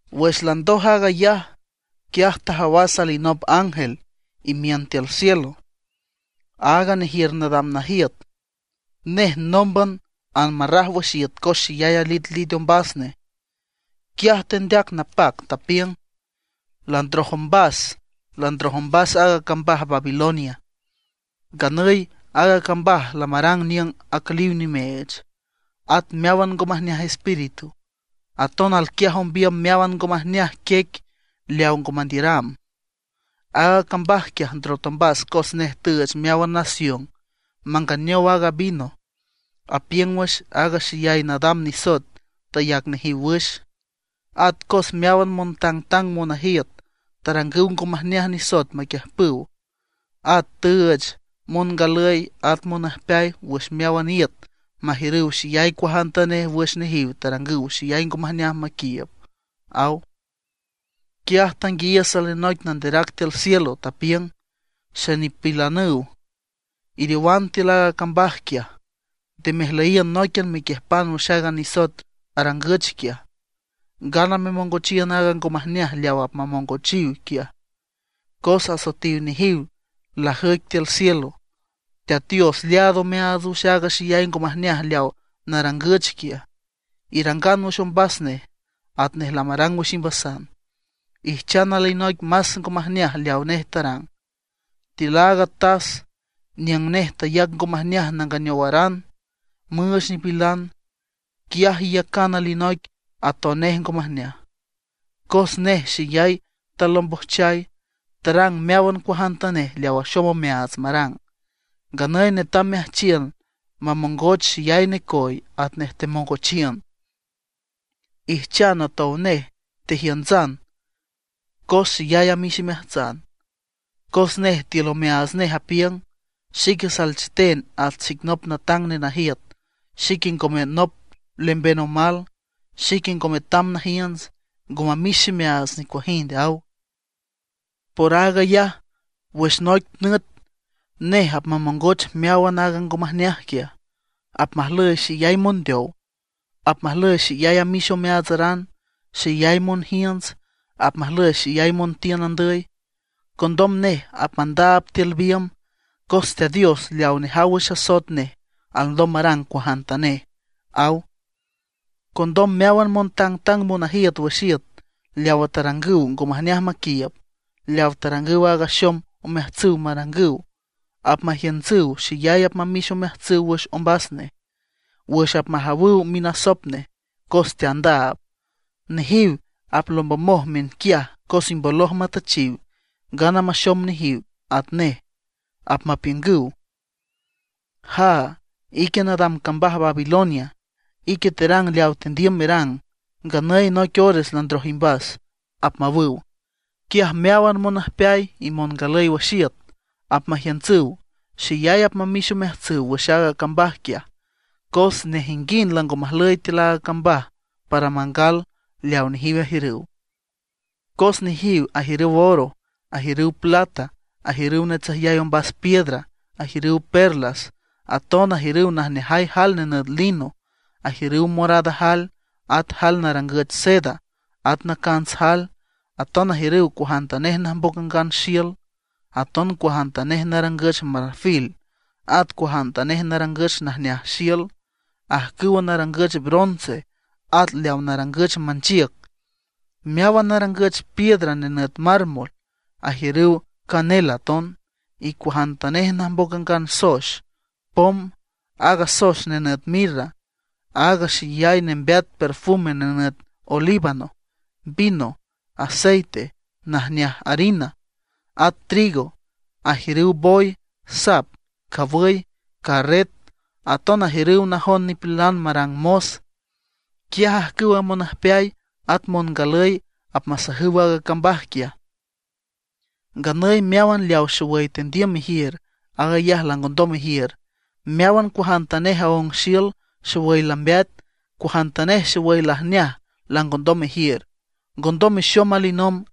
Wüx landoj aag ayaj, quiaj tajawas alinop ángel imiün tiül cielo, áaga nejiür nadam najiüt. Nej nómban anmarraj wüx iüt cos xeyay alitlit ombas nej. Quiaj tendeac napac, tapiüng: ―¡Landroj ombas, landroj ombas aaga cambaj Babilonia! Nganüy aaga cambaj lamarang niüng acüliw nimeech, at meáwan ngo majneaj espíritu. Aton alquiaj ombiüm meáwan ngo majneaj quiec leaw ngo mandiüram. Aaga cambaj quiaj ndrot ombas cos nej tüüch meáwan nación manganeow aaga vino apiüng wüx aaga xeyay nadam nisoet tayac nejiw wüx; at cos meáwan montangtang monajiüt tarangüw ngo majneaj nisoet maquiüjpüw. At tüüch mongalüy at monüjpeay wüx meáwan iüt majiürüw xeyay cuajantanej wüx nejiw tarangüw xeyay ngo majneaj maquiiüb ―aw. Quiaj tanguiayiüs alinoic nanderac tiül cielo, tapiüng: ―Xenipilanüw, iriowan tiül aaga cambaj quiaj; nde mejlüyiün nóiquian mequiüjpan wüx aaga nisoet arangüch quiaj, ngana memongochiün aaga ngo majneaj leaw apmamongochiw quiaj. Cos asoetiw nejiw lajüic tiül cielo. Teat Dios leaad omeaats wüx aaga xeyay ngo majneaj leawa narangüch quiaj. Irangan wüx ombas nej atnej lamarang wüx imbasan; ijchan alinoic más ngo majneaj leaw nej tarang. Tiül aaga tas niüng nej tayac ngo majneaj nanganeowaran müüch nipilan, quiaj iyacan alinoic atonej ngo majneaj. Cos nej xeyay talombojchay, tarang meáwan cuajantanej leaw axom omeaats marang. Nganüy netam meajchiün mamongoch xeyay necoy atnej temongochiün, ijchan atonej tejiüntsan cos xeyay amix imeajtsan. Cos nej tiül omeaats nej apiüng: “Xique salcheten at xic nop natang nenajiüt, xique ngome nop lemben omal, xique ngo metam najiünts, ngo mamix ximeaats nicuajind”, aw. Por aag ayaj, wüx noic nüt nej apmamongoch meáwan aaga ngo majneaj quiaj. Apmajlüy xeyay mondeow; apmajlüy xeyay amix omeaatsaran, xeyay monjiünts; apmajlüy xeyay montiün andüy. Condom nej apmandaab tiül biümb, cos Teat Dios leaw nejaw wüx asoet nej alndom marang cuajantanej ―aw. Condom meáwan montangtang monajiüt wüx iüt leawa tarangüw ngo majneaj maquiiüb, leaw tarangüw aaga axom omeajtsüw marangüw, apmajiüntsüw, xeyay apmamix omeajtsüw wüx ombas nej, wüx apmajawüw minasop nej cos teandaab. Nejiw aplombomoj miünquiaj cos imboloj matüchiw, ngana maxom nejiw atnej. Apmapiüngüw: ―¡Jaa, ique nadam cambaj Babilonia! Ique terang leaw tendiüm merang, nganüy noic ores landroj imbas ―apmawüw. Quiaj meáwan monüjpeay y mongalüy wüx iüt apmajiüntsüw, xeyay apmamix omeajtsüw wüx aaga cambaj quiaj; cos nejinguind lango majlüy tiül aaga cambaj para mangal leawa nejiw ajiürüw. Cos nejiw ajiürüw oro, ajiürüw plata, ajiürüw natsüjyay ombas piedras, ajiürüw perlas. Aton ajiürüw najneajay jael nenüt lino, ajiürüw morada jael, at jael narangüch seda, at nacants jael. Aton ajiürüw cuajantanej najmboc angan xiül, aton cuajantanej narangüch marfil, aton cuajantanej narangüch najneaj xiül, ajcüw narangüch bronce, at leawa narangüch manchiüc, meáwan narangüch piedra nenüt mármol. Ajiürüw canela aton, y cuajantanej najmboc angan soex, pom, aaga soex nenüt mirra, aaga xeyay nembeat perfume nenüt olíbano, vino, aceite, najneaj harina, at trigo. Ajiürüw boy, sap, cawüy, carret, aton ajiürüw najon nipilan marang mos. Quiaj ajcüwa monüjpeay at mongalüy apmasajüw aaga cambaj quiaj: ―Nganüy meáwan leaw xowüy tendiüm mejiür, aag ayaj langondom mejiür. Meáwan cuajantanej aóng xiül xowüy lambeat, cuajantanej xowüy lajneaj langondom mejiür, ngondom mexom alinomb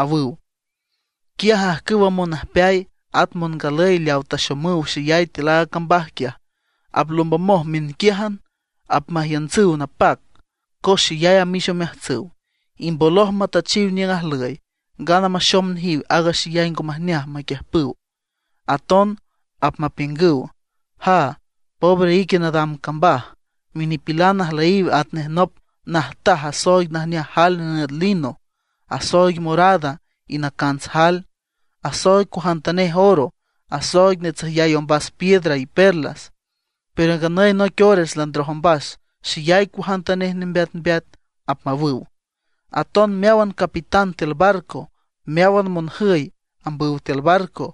―awüw. Quiaj ajcüwa monüjpeay at mongalüy leawa taxomüw xeyay tiül aaga cambaj quiaj, aplombomoj miünquiájan, apmajiüntsüw napac, cos xeyay amix omeajtsüw, imboloj matüchiw niüng ajlüy, ngana maxom nejiw aaga xeyay ngo majneaj maquiüjpüw. Aton apmapiüngüw: ―¡Jaa, pobre ique nadam cambaj! Minipilan ajlüyiw atnej nop najtaj asooig najneaj jael nenüt lino, asooig morada y nacants jael. Asooig cuajantanej oro, asooig natsüjyay ombas piedras, y perlas; pero nganüy noic ores landroj ombas xeyay cuajantanej nembeatmbeat ―apmawüw. Aton meáwan capitán tiül barco, meáwan monjüy ambüw tiül barco,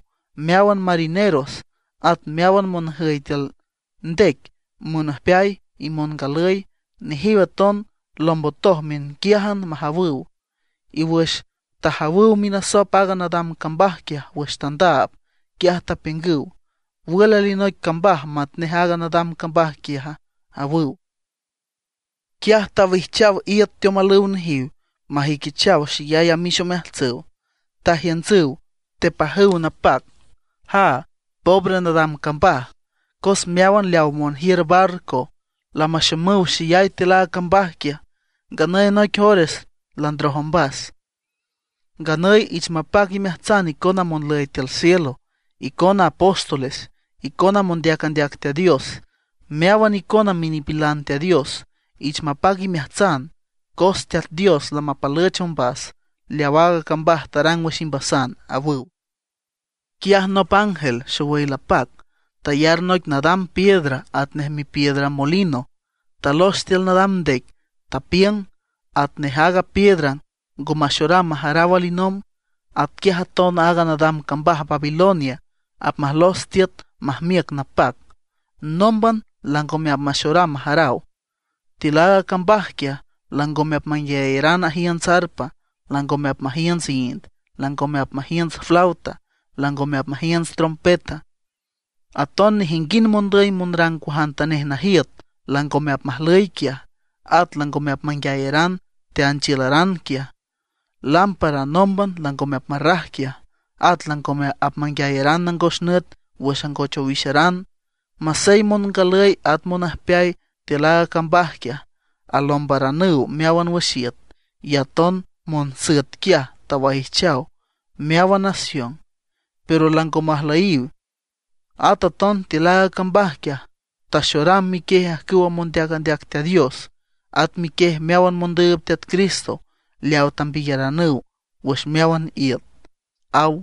meáwan marineros, at meáwan monjüy tiül ndec menüjpeay y mengalüy, nejiw aton lombotoj miünquiájan majawüw, y wüx tajawüw minasop aaga nadam cambaj quiaj wüx tandaab, quiaj tapiüngüw: ―¿Wül alinoic cambaj matnej aaga nadam cambaj quiaja? ―awüw. Quiaj tawijchaw iüt teomalüw nejiw majüiquichaw xeyay amix omeajtsüw. Tajiüntsüw, tepajüw napac: ―¡Jaa! ¡Pobre nadam cambaj! Cos meáwan leawa monjiür barco lamaxomüw xeyay tiül a cambaj quiaj. ¡Nganüy noic ores landroj ombas! ’Nganüy ich mapac imeajtsan icona monlüy tiül cielo, icona apóstoles, icona mondeac andeac Teat Dios, meáwan icona minipilan Teat Dios. Ich mapac imeajtsan, cos Teat Dios lamapalüch ombas leaw aaga cambaj tarang wüx imbasan ―awüw. Quiaj nop ángel xowüy lapac tayar noic nadam piedra atnej mipiedra molino, talox tiül nadam ndec, tapiüng: ―Atnej aaga piedra ngo maxoram majaraw alinomb, atquiaj aton aaga nadam cambaj Babilonia apmajlos tiüt majmiüc napac, nómban langome apmaxoram majaraw. Tiül aaga cambaj quiaj, langome apmanguiayaran ajiünts arpa, langome apmajiünts ind, langome apmajiünts flauta, langome apmajiünts trompeta. Aton nejinguind mondüy monrang cuajantanej najiüt langome apmajlüy quiaj. At langome apmanguiayaran teanchiülaran quiaj. Lámpara nómban langome apmarraj quiaj, at langome apmanguiayaran nangos nüt wüx angoch owixaran. Masey mongalüy at monüjpeay tiül aaga cambaj quiaj, alombaranüw meáwan wüx iüt, y aton monsüet quiaj tawaijchaw meáwan nación, pero lango majlüyiw. At aton tiül aaga cambaj quiaj taxoram miquiej ajcüwa mondeac andeac Teat Dios, at miquiej meáwan mondüüb Teat Cristo leaw tambiyaranüw wüx meáwan iüt ―aw.